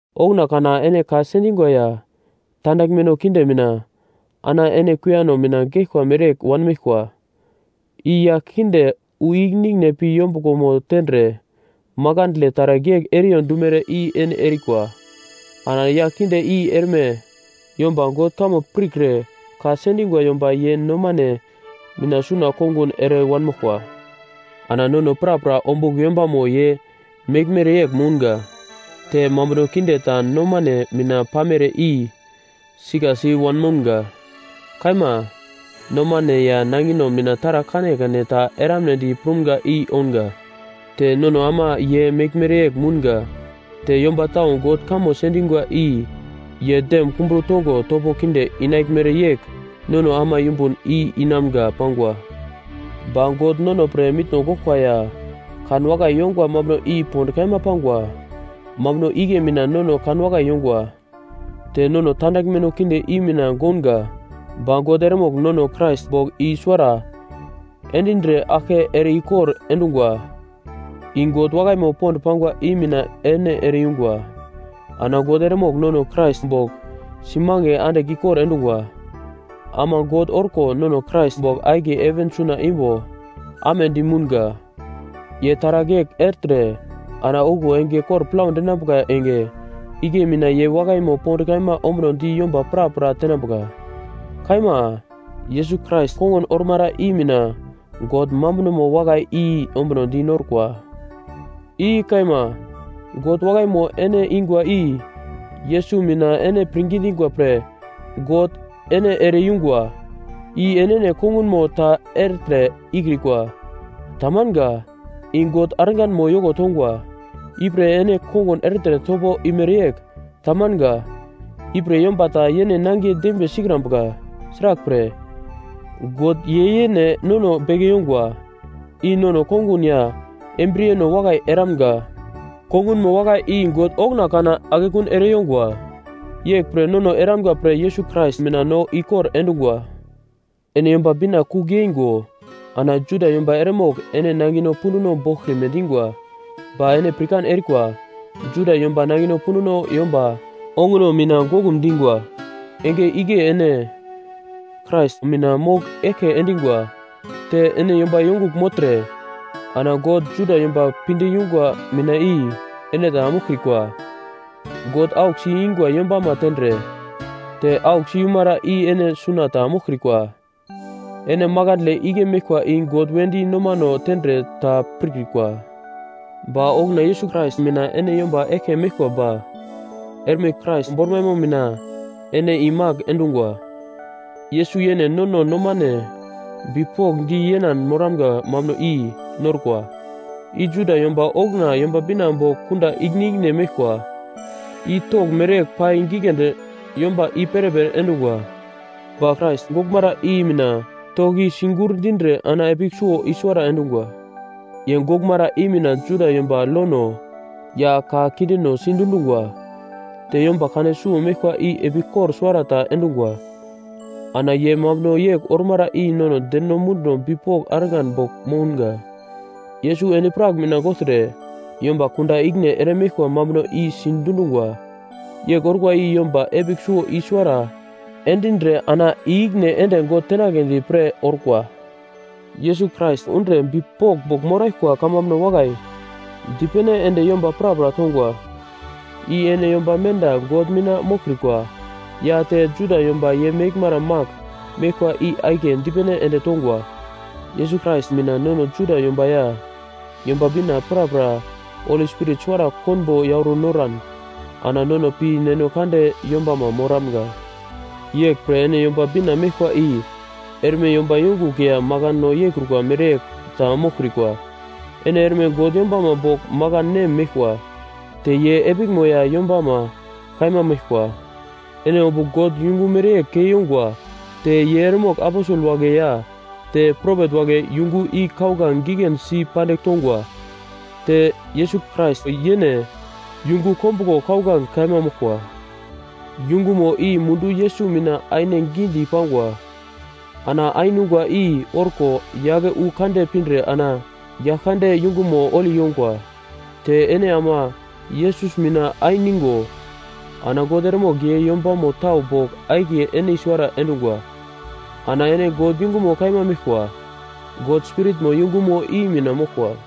Okuna kana ene ka sendingwa ya tandaglmeno kinde mina ana ene kuiyano mina geglkwa mereyegl wanmeglkwa. I yagl kinde wu ikine ikine pi yombuglomo tendre makandle taragl yegl eriyo dumere i ene erikwa, ana yagl kinde i erme yomba God kamo pirkre ka sendingwa yomba ye nomane mina suna kongun ere wanmoglkwa. Ana nono prapra ombugl yombamo ye meglmere yegl mounga, te mambuno kinde ta nomane mina pamere i sikasi wanmounga. Kaima, nomane ya nangino mina taragl kanekane ta eramnedi prumga i ounga. Te nono ama ye meglmere yegl mounga, te yomba tau God kamo sendingwa i ye dem kumbro tongo topo kinde inaglmere yegl nono ama yumbun i inamga pangwa. Ba God nono pre mitno goglkwa ya kanwakai yongwa mambuno i pond kaima pangwa, mambuno igle mina nono kanwakai yongwa, te nono tandaglmeno kinde i mina gounga, ba God eremogl nono Krais bogl i suwara endindre aglke ere-ikor endungwa. I God wakaimo pond pangwa i mina ene ere-yungwa. Ana God eremogl nono Krais bogl simange andigl ikor endungwa. Ama God orko nono Krais bogl akiye heven suna imbo amedi mounga. Ye taragl yegl ertre ana okuwo enge kor plau dinambuka enge igle mina ye wakaimo pond kaima ombunodi yomba prapra tenambuka. Kaima, Yesus Krais kongun ormara i mina God mambunomo wakai i ombunodi norkwa. I kaima, God wakaimo ene ingwa i Yesus mina ene pirngi dingwa pre God ene ere-yungwa, i enene kongunmo ta ertre ikrikwa, tamanga; i God arganmo yoko tongwa, ipre ene kongun ertre topo imere yegl, tamanga, ipre yomba ta yene nangiye dembiye sikrambuka. Sraglpre, God ye yene nono beke yongwa, i nono kongun ya embriyeno wakai eramga, kongunmo wakai i God okuna kana akekun ere yongwa, yeglpre nono eramga pre Yesus Krais mina no ikor endungwa. Ene Yomba Bina kugl yeingo ana Juda yomba eremogl ene nangino punduno boglkrime dingwa, ba ene pirkan erikwa Juda yomba nangino punduno yomba onguno mina goglum dingwa. Enge igle ene Krais mina mogl eglke endingwa. Te ene yomba yongugl mogltre, ana God Juda yomba pinde yungwa mina i ene ta moglkrikwa. God auglsi ingwa yombama tendre, te auglsi yumara i ene suna ta moglkrikwa. Ene makandle igle meglkwa i God wedi nomano tendre ta pirkrikwa. Ba okuna Yesus Krais mina ene yomba eglke meglkwa ba erme Krais bormaimo mina ene imagl endungwa. Yesus yene nono nomane bipokndi yenan moramga mambuno i norkwa, i Juda yomba okuna Yomba Bina bogl kunda ikine ikine meglkwa. I togl mereyegl pai giglendi yomba i-perepere endungwa. Ba Krais goglmara i mina togl i sigurndindre ana epigl suwo i suwara endungwa. Ye goglmara i mina Juda yomba lono ya ka kindeno sidundungwa, te yomba kane suwo meglkwa i epigl kor suwara ta endungwa, ana ye mambuno yegl ormara i nono deno munduno bipok argan bogl mounga. Yesus endi-prak mina gogltre yomba kunda ikine ere meglkwa mambuno i sidundungwa. Yegl orkwa i yomba epigl suwo i suwara endindre ana i-ikine ende God tenagledi pre orkwa. Yesus Krais undre bipok bogl moraglkwa kamambuno wakai dipene ende yomba prapra tongwa, i ene yomba menda God mina moglkrikwa ya te Juda yomba ye meglmara magl meglkwa i akiye dipene ende tongwa. Yesus Krais mina nono Juda yomba ya Yomba Bina prapra Holi Spirit suwara konbo yauro noran ana nono pi Neno Kande yombama moramga. Yeglpre ene Yomba Bina meglkwa i erme yomba yongugl ya makano yeikrukwa mereyegl ta moglkrikwa. Ene erme God yombama bogl makan nem meglkwa, te ye epiglmo ya yombama kaima meglkwa. Ene ombugl God yungu mereyegl kei yongwa te ye eremogl aposel wagle ya te propet wagle yungu i kauglange giglendi si pandigl tongwa. Te Yesus Krais yene yungu kombuglo kauglange kaima moglkwa. Yungumo i mundu Yesus mina aine gidi pangwa, ana ainungwa i orko yake wu kande pindre ana Yaglkande yungumo holi yongwa. Te ene ama Yesus mina ainigo ana God eremogl ye yombamo tau bogl akiye ene i-suwara endungwa. Ana ene God yungumo kaima meglkwa, God Spiritmo yungumo i mina moglkwa.